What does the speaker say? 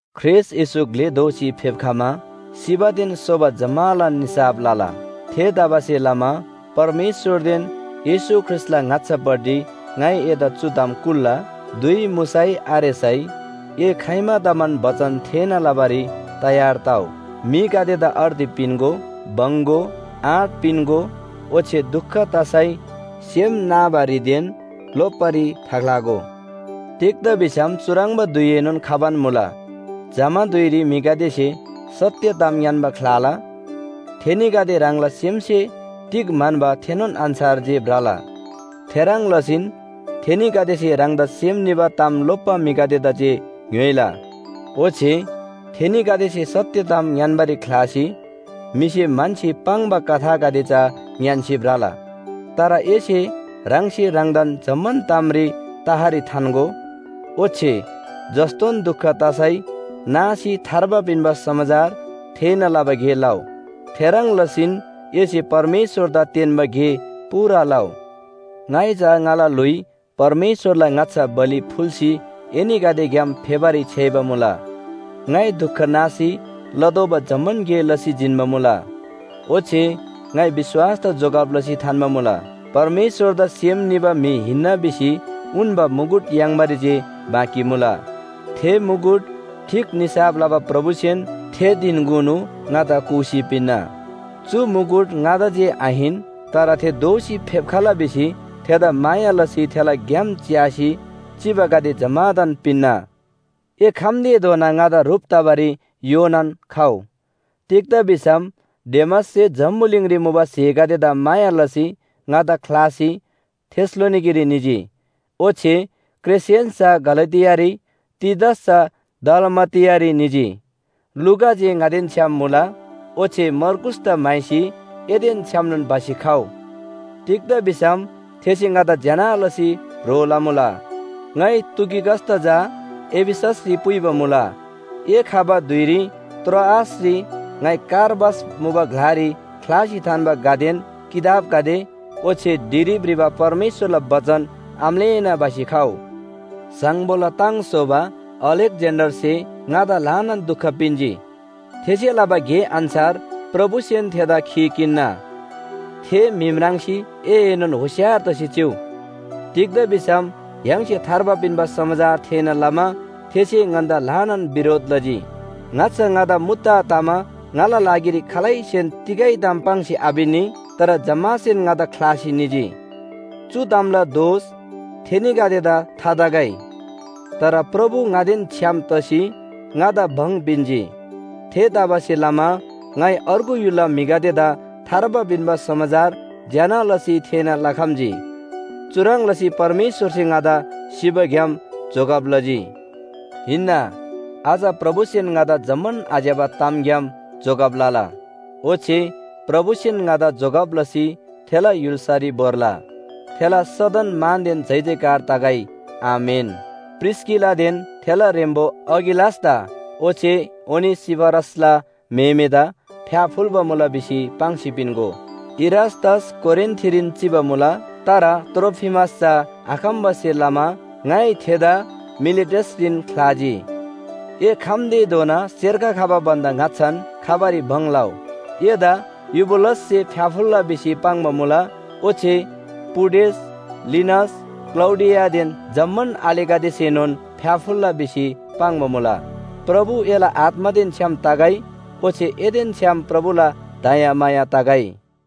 ख्रीष्‍ट येशू ग्‍ले दोसी फेप्‍खमा सिबादेन सोबा जम्‍मालान निसाफ लला। थेतबासेलमा परमेश्‍वरदेन येशू ख्रीष्‍टला ङाच्‍छापट्टि ङाइ एदा चु ताम कुल्‍ला। धुइ मुसै आरेसै ए खाइमादमान बचन थेःना लबारी तयार तउ, म्‍हिगदेदा अर्ती पिन्‍गो, बङ्‍‌गो, आँट पिन्‍गो, ओच्‍छे दुख तसै सेम नाबारीदेन लोप्‍बारी थाख्‍लागो। तिग्‍दा भिसम चुह्रङ्बा धुइएनोन खबान मुला, जमा धुइरी म्‍हिगदेसे सत्‍य ताम ङ्‌यान्‍बा ख्‍लाला, थेनीगदे ह्राङला सेमसे तिग म्‍हन्‍बा थेनोन अन्‍छार जे भ्रला। थेह्रङ् लसीन थेनीगदेसे ह्राङदा सेम निबा ताम लोप्‍बा म्‍हिगदेदा जे ङ्‌योइला। ओच्‍छे थेनीगदेसे सत्‍य ताम ङ्‌यान्‍बारी ख्‍लासी म्‍हिसे म्‍हन्‍सी पाङ्बा कथागदे चा ङ्‌यान्‍सी भ्रला। तर एसे ह्राङसे ह्राङदान जम्‍मान तामरी तहरी थान्‍गो, ओच्‍छे जस्‍तोन दुख तसै नासी थार्बा पिन्‍बा समाचार थेःना लबा गे लउ। थेह्रङ् लसीन एसे परमेश्‍वरदा तेन्‍बा गे पूरा लउ। ङाइ चा ङाला ल्‍हुइ परमेश्‍वरला ङाच्‍छा बलि फुल्‍सी एनीगदेग्‍याम फेबारी छ्‌याइबा मुला। ङाइ दुख नासी लतोःबा जम्‍मान गे लसी जिन्‍बा मुला। ओच्‍छे ङाइ विश्‍वासदा जोगब लसी थान्‍बा मुला। परमेश्‍वरदा सेम निबा म्‍हि हिन्‍ना भिसी उन्‍बा मुकुट याङ्बारी जे बाँकी मुला। थे मुकुट ठीक निसाफ लबा प्रभुसेन थे धिनकुनु ङादा कूसी पिन्‍ना। चु मुकुट ङादा जे आहिन, तर थे दोःसी फेप्‍खला भिसी थेदा माया लसी थेला ग्‍याम च्‍यासी चिबागदे जम्‍मादान पिन्‍ना। ए खम्‍तेधोना ङादा ह्रुप तबारी योनान खउ। तिग्‍दा भिसम डेमाससे जम्‍बुलिङरी मुबा स्‍हेगदेदा माया लसी ङादा ख्‍लासी थेसलोनिकेरी निजी। ओच्‍छे क्रेसेन्‍स चा गलातियारी, तीतस चा दलमातियारी निजी। लूका जे ङादेन छ्‌याम मुला। ओच्‍छे मर्कूसदा म्‍हाइसी एदेन छ्‌यामनोन भसी खउ। तिग्‍दा भिसम थेसे ङादा ज्‍यना लसी ह्रो लमुला। ङाइ तुखिकसदा चा एफिससरी पुइबा मुला। ए खबा धुइरी त्रोआसरी ङाइ कार्पस मुबा ग्‍लारी ख्‍लासी थान्‍बा घदेन किताबगदे, ओच्‍छे ढिरी भ्रिबा परमेश्‍वरला बचन आम्‍लेःना भसी खउ। स्‍हाङ्‌बोला ताङ स्‍होबा अलेक्‍जेन्‍डरसे ङादा ल्‍हानान दुख पिन्‍जी। थेसे लबा गे अन्‍छार प्रभुसेन थेदा खी किन्‍ना। थे म्‍हि म्राङ्सी एएनोन होशियार तसी चिउ। तिग्‍दा भिसम य्‍हाङसे थार्बा पिन्‍बा समाचार थेःना लमा थेसे ङन्‍दा ल्‍हानान बिरोध लजी। ङाच्‍छा ङादा मुद्दा तमा ङाला लागिरी खालैसेन तिगै ताम पाङ्सी आपिन्‍नी, तर जम्‍मासेन ङादा ख्‍लासी निजी। चु तामला दोष थेनीगदेदा थातगै। तर प्रभु ङादेन छ्‌याम तसी ङादा भङ पिन्‍जी। थेतबासेलमा ङाइ अर्गु य्‍हुलला म्‍हिगदेदा थार्बा पिन्‍बा समाचार ज्‍यना लसी थेःना लखम्‍जी। चुह्रङ् लसी परमेश्‍वरसे ङादा सिबाग्‍याम जोगब लजी। हिन्‍ना, अझ प्रभुसेन ङादा जम्‍मान आज्‍यबा तामग्‍याम जोगब लला, ओच्‍छे प्रभुसेन ङादा जोगब लसी थेला य्‍हुल्‍सारी भोर्ला। थेला सदन मानदेन जयजयकार तगै। आमेन। प्रिस्‍किलादेन थेला ह्रेम्‍बो अकिलासदा ओच्‍छे ओनेसिफरसला म्‍हेमेदा फ्‍याफुल्‍बा मुला भिसी पाङ्सी पिन्‍गो। इरास्‍तस कोरिन्‍थरीन चिबा मुला, तर त्रोफिमस चा आखम्‍बासे लमा ङाइ थेदा मिलेटसरीन ख्‍लाजी। ए खम्‍तेधोना सेर्ख खबा भन्‍दा ङाच्‍छान खबारी भङ लउ, एदा युबुलससे फ्‍याफुल्‍ला भिसी पाङ्बा मुला, ओच्‍छे पुडेस, लिनस, क्‍लौडियादेन जम्‍मान आलेगदेसेनोन फ्‍याफुल्‍ला भिसी पाङ्बा मुला। प्रभु एला आत्‍मादेन छ्‌याम तगै। ओच्‍छे एदेन छ्‌याम प्रभुला दयामाया तगै।